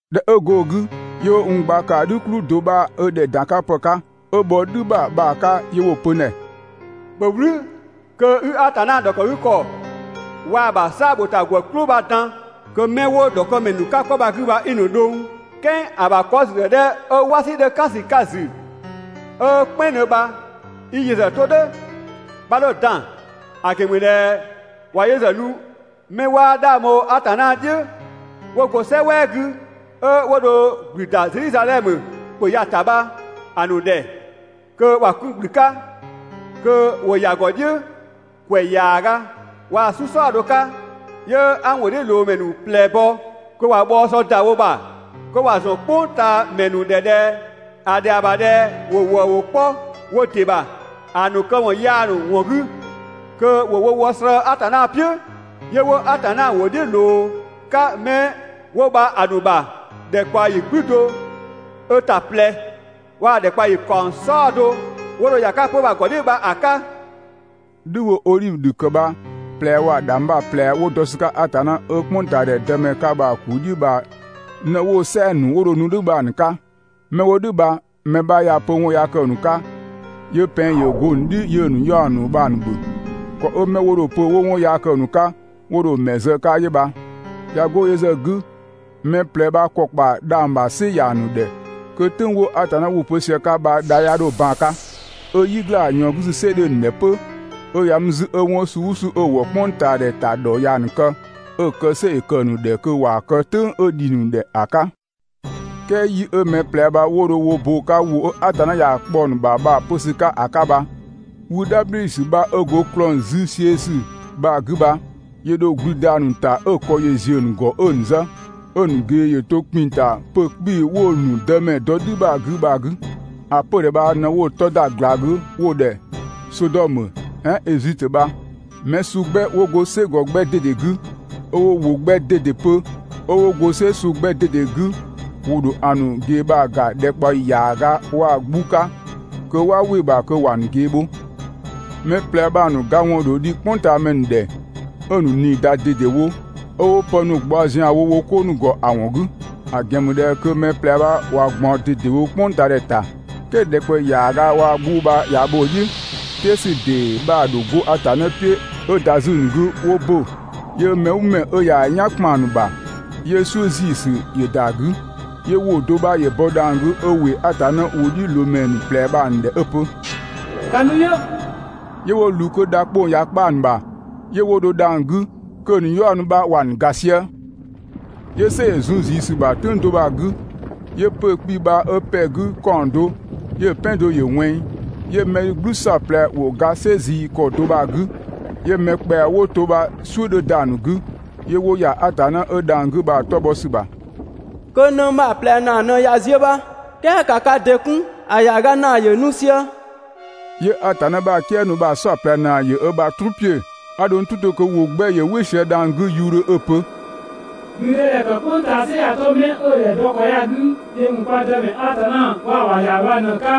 ꞊Dhɛ 'ö go‑ 'gü, 'yö 'wo n gba ‑kaa "dhü "kplü do 'bha ö ‑dhɛ ‑dan 'ka ‑pë 'ka, 'ö bhɔ "dhü ‑bha bha‑ 'ka 'yö 'wo‑ pö n ‑dhɛ: «‑Bhö "wlü kö 'i Atanna ‑dhɔkëgükɔ waa‑ ‑bha "saa‑ ‑bho ‑ta ‑gwë "klʋ bha‑ dan, kö 'mɛ 'wo‑ ‑dhɔkëmɛ ‑nu 'ka 'kɔ bha‑ 'gü bha 'i‑ ‑nu dhʋng. "Kɛɛ ‑a ‑bha 'kɔ ‑züdhɛ 'dhɛ 'ö "wasi 'dhö "kan ‑sü 'ka‑ ‑zü 'ö "kpɛnngdhö bha 'i yö ‑zë 'to "dhʋ̈, 'bha 'dho‑ dan, ‑a ‑gɛn ‑mü ꞊dhɛ ꞊wa yö ‑zë nu 'mɛ 'waa 'dhang bho Atanna "dhiʋ̈ 'wo go "sɛ "wɛɛ 'gü, 'ö 'wo dho ‑gblü ‑da Zedhizadhɛmö ‑pö ya‑ ‑ta bha‑ ‑nu ‑dhɛ kö ‑wa 'kun ‑gblü 'ka, kö ‑wo ‑ya ‑gɔ "dhiʋ̈ ‑kwɛ ‑yaaga waa‑ "su "saɔdo 'ka. 'Yö 'a n ‑wʋdhiʋ̈loomɛ ‑nu ꞊plɛ bɔ kö ꞊wa bhɔɔ sɔ ‑da wo ‑bha, kö ‑wa ‑zɔn "kpʋngtaamɛ ‑nu ‑dhɛ ꞊dhɛ ‑a ‑dhɛa ‑bha ꞊dhɛ ‑wo ‑wëëwʋ 'kpɔ wo ‑dɩ ‑bha ‑a ‑nu këwɔn yaa ‑nu ‑wɔn 'gü kö ‑wo wo wɔ slëë‑ Atanna "piʋ̈, 'yö 'wo Atanna ‑wʋ "dhiʋ̈ ꞊loo‑ 'ka 'mɛ 'wo bha‑ ‑nu ‑bha ‑dhɛkpaɔyi "gblü do ö ‑ta ꞊plɛ waa‑ ‑dhɛkpaɔyi ‑kaɔng "saɔdo 'wo dho ‑ya 'ka 'pö‑ bha‑ ‑gɔ "dhiʋ̈ bha‑ 'ka.» "Dhü 'wo‑ odhivö ‑dhü ‑kë bha‑ ꞊plɛ waa‑ ‑dhangbha ꞊plɛ 'wo dɔ ‑sü 'ka Atanna 'ö "kpʋngtaadhɛ dëmɛ 'ka bha‑ ‑kuu "dhiʋ̈ bha ꞊në 'wo‑ "sɛɛ‑ ‑nu 'wo dho nu "dhʋ̈ bha‑ ‑nu 'ka. 'Mɛ 'wo "dhʋ̈ bha mɛ 'bha ꞊yaa‑ pö 'ö 'wɔn yaa kë‑ ‑nu 'ka, 'yö pɛng ‑yö go‑ ‑nu "dhi 'yö‑ ‑nu 'yaɔ‑ ‑nu bha‑ ‑nu ‑bhö. ‑Kɔ 'ö 'mɛ 'wo dho‑ pö 'wo 'wɔn yaa kë‑ ‑nu 'ka, 'wo dho‑ ‑mɛ ‑nu zë‑ 'ka 'yö bha. ꞊Ya 'go yö ‑zë 'gü, mɛ ꞊plɛ bha ‑kɔ ‑kpa dhang‑ ‑bha "sɩ ‑ya ‑nu ‑dhɛ kö "tʋ̈ng 'wo Atanna ‑wʋ pö sië‑ 'ka bha dha 'ya 'dho ban‑ 'ka, 'ö "yi ‑gla ꞊yɔɔn 'gü "sɩ 'dhö‑ ‑nu ‑dhɛ 'pö, 'ö ‑ya mü 'zü 'ö 'wɔn suu "ʋʋ suu 'ö‑ ‑wɔ "kpʋngtaadhɛ ‑ta ‑dhɔ ꞊yaa‑ ‑nu kë, 'ö‑ kë "sɩ ‑yö ‑kë ‑nu ‑dhɛ kö ‑wa kë "dhʋ̈ "tʋ̈ng 'ö ‑dhi ‑nu ‑dhɛ ‑a 'ka. "Kɛɛ yi 'ö mɛ ꞊plɛ bha 'wo dho wo bo‑ 'ka ‑wʋ 'ö Atanna ‑ya kpɔ‑ ‑nu ‑bha bha‑ pö ‑sü 'ka ‑a 'ka bha, wü "dhabhli ‑sü 'bha 'ö go ‑klɔng züziösü bha‑ 'gü bha ‑yö ‑dho ‑gblü ‑da ‑a ‑nu ‑ta 'ö‑ ‑kɔ ‑yö ‑ziö ‑nu ‑gɔ 'ö‑ ‑nu zë, 'ö‑ ‑nu ꞊gee ‑yö to ‑kpinng ‑ta 'pö‑ 'kpii‑ 'wo‑ ‑nu Dëmɛ dɔ "dhü ‑bha ‑a 'gü bha‑ 'gü. ‑A 'pödhɛ bha ꞊në 'wo‑ 'tɔ ‑da ꞊gla 'gü 'wo‑ ‑dhɛ Sodɔmö "ɛɛn Ezitö bha. Mɛ suu 'gbɛ, 'wo go "sɛgɔ 'gbɛ ꞊dede 'gü, 'ö 'wo ‑wʋ 'gbɛ ꞊dede pö, 'ö 'wo go "sɛ suu 'gbɛ ꞊dede 'gü ‑wo ‑dho ‑a ‑nu ꞊gee bha‑ ‑ga ‑dhɛkpaɔyi ‑yaaga waa‑ 'gbu 'ka kö 'waa "wɩ‑ ‑bha kö ‑wa ‑nu ꞊gee bho. Mɛ ꞊plɛ bha‑ ‑nu ga ‑wɔn ‑dho dhi "kpʋngtaamɛ ‑nu ‑dhɛ, 'ö‑ ‑nu ꞊nii ‑da ꞊dedewo 'ö 'wo pë ‑nu ꞊gbaɔ ‑zianwo wo 'ko ‑nu ‑gɔ ‑a ‑wɔn 'gü, ‑a ‑gɛn ‑mü ꞊dhɛ kö mɛ ꞊plɛ bha ꞊wa ꞊gbaɔn ꞊dedewo "kpʋngtaadhɛ ‑ta. "Kɛɛ ‑dhɛkpaɔyi ‑yaaga waa‑ 'gbu bha ꞊ya bho‑ "dhiʋ̈, "tɛɛ ‑sü ‑dee 'bha‑ ‑dho 'go Atanna "piʋ̈ 'ö ‑da 'zü‑ ‑nu 'gü 'wo ‑bö, 'yö mɛ "ʋʋ mɛ 'ö ꞊ya ö "yan ‑kpan ‑nu ‑bha, 'yö "suʋ̈ ‑ziisü ‑yö ‑da 'gü. 'Yö ‑wʋ do 'bha 'yö bɔ dhang‑ 'gü 'ö ‑wɩ Atanna ‑wʋdhiʋ̈loomɛ ‑nu ꞊plɛ bha‑ ‑nu ‑dhɛ 'ö‑ pö: «‑Ka nu yö!» 'Yö 'wo ꞊wlü kö dha 'kpong‑ ꞊ya kpa‑ ‑nu bha 'yö 'wo dho dhang‑ 'gü, kö‑ ‑nu 'yaɔ‑ ‑nu bha ‑wa ‑nu ga sië. 'Yö "sɛ ‑yö zun ꞊zii ‑sü ‑bha "tʋ̈ng do bha‑ 'gü, 'yö 'pö‑ 'kpii‑ bha 'ö ‑pɛ 'gü ‑kaɔng do, 'yö‑ "pɛan do ‑yö ꞊wɛnng, 'yö mɛ ‑dhü "gblü "saɔplɛ ‑wo ga "sɛ ꞊zii ‑kɔ do bha‑ 'gü, 'yö mɛ ‑kpɛa 'wo to bha "suʋ̈ 'dhö ‑da ‑nu 'gü, 'yö 'wo ‑ya Atanna 'ö dhang‑ 'gü bha‑ 'tɔ bhɔ ‑sü ‑bha. Kö nëng bha‑ ꞊plɛ ‑naa ꞊në ꞊ya ziö bha, "kɛɛ ‑ka ka ‑dɩ 'kun, ‑a ‑yaaga ‑naa ‑yö nu sië.» 'Yö Atanna ‑bha "kië ‑nu bha‑ "saɔplɛ ‑naa ‑yö ö ‑bha "truu ‑piö. 'A dho n "tʋ 'to kö ‑wʋ 'gbɛ ‑yö "wɩ sië dhang‑ 'gü ‑yuudhö 'ö‑ pö: «‑Gblüdëdhɛ ‑kë "kpʋng ꞊taa "sɩ ꞊ya 'to 'mɛ 'ö‑ ‑dhɛ, dɔ ‑kɔ ya‑ 'gü yö ‑mü kwa Dëmɛ Atanna waa‑ ‑bha ‑Yamɛ bha ꞊në‑ ‑nu 'ka,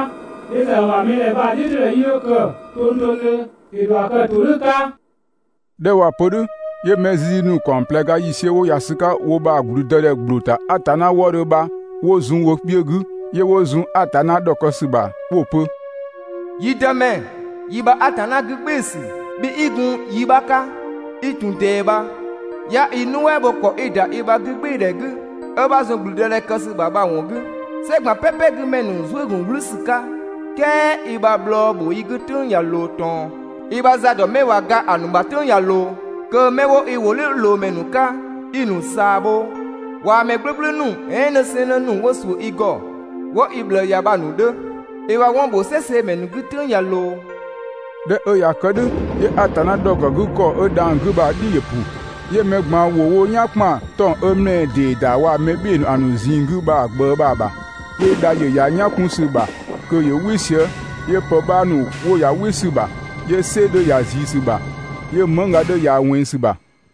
yö ‑zë ‑a ‑bha mɛ ‑dhɛ bha‑ "dhiʋ̈todhɛ 'yii 'dho kë tongtongdhö, ‑yö ‑dho ‑a kë ‑todhʋ̈ 'ka!» ꞊Dhɛ 'ö ꞊waa‑ pö "dhʋ̈, 'yö mɛ zizi ‑nu ‑kaɔng ꞊plɛ ga ‑yiisiö 'wo ‑ya ‑sü 'ka wo ‑bha ‑blüdëdhɛ ‑gbloo ‑ta Atanna wëëdhö bha 'wo zun wo kpiö 'gü, 'yö 'wo zun Atanna ‑dhɔkë ‑sü bha 'wo‑ pö: «Yi Dëmɛ, yi ‑bha Atanna 'gügbɩɩsü, bhi i gun yi 'bha 'ka, 'i ‑tun ꞊dɛɛ bha, 'ya i nuɛ" bho ‑kɔ 'i‑ ‑da i ‑bha 'gügbɩɩdhɛ 'gü 'ö 'bha zun ‑gblüdëdhɛ kë ‑sü ‑bha bha‑ ‑wɔn 'gü, "sɛ ꞊gban "pɛpɛ 'gü ‑mɛ ‑nu zuë" ‑gun "wlü ‑sü 'ka, "kɛɛ i ‑bha bhlɔɔ bho i 'gü "tʋ̈ng ꞊ya ꞊loo ꞊tɔn, i ‑bha za ‑dɔ 'mɛ ꞊wa ga ‑a ‑nu ‑bha "tʋ̈ng ꞊ya ꞊loo, kö 'mɛ 'wo i ‑wʋdhiʋ̈loomɛ ‑nu 'ka 'i‑ ‑nu ꞊saa bho waa‑ mɛ "gblʋ̈gblʋ̈ ‑nu "ɛɛn 'nësɛɛnnë ‑nu 'wo ‑suʋ̈ i ‑gɔ, 'wo i ꞊bhlëë ‑ya bha‑ ‑nu 'dhö. I ‑bha 'wɔn ‑bho "sɛ seemɛ ‑nu 'gü "tʋ̈ng ꞊ya ꞊loo!» ꞊Dhɛ 'ö ꞊ya kë "dhʋ̈, 'yö Atanna ‑dhɔkëgükɔ 'ö dhang‑ 'gü bha‑ "dhi ‑yö ‑pʋ, 'yö mɛ ꞊gban 'wo wo "yan ‑kpan 'tɔng‑ 'ö ‑mlɛɛ ‑dee ‑da waa‑ mɛ "bhɩɩ‑ ‑nu ‑a ‑nu ꞊zinng 'gü bha‑ ꞊gbëë bha‑ ‑bha. 'Yö dha ‑yö ‑ya "yan 'kun ‑sü ‑bha kö ‑yö "wɩ sië, 'yö pë 'bha ‑nu 'wo ‑ya "wɩ ‑sü ‑bha, 'yö "sɛ 'dhö ‑ya ꞊zii ‑sü ‑bha, 'yö mëngga 'dhö ‑ya ꞊wɛnng ‑sü ‑bha.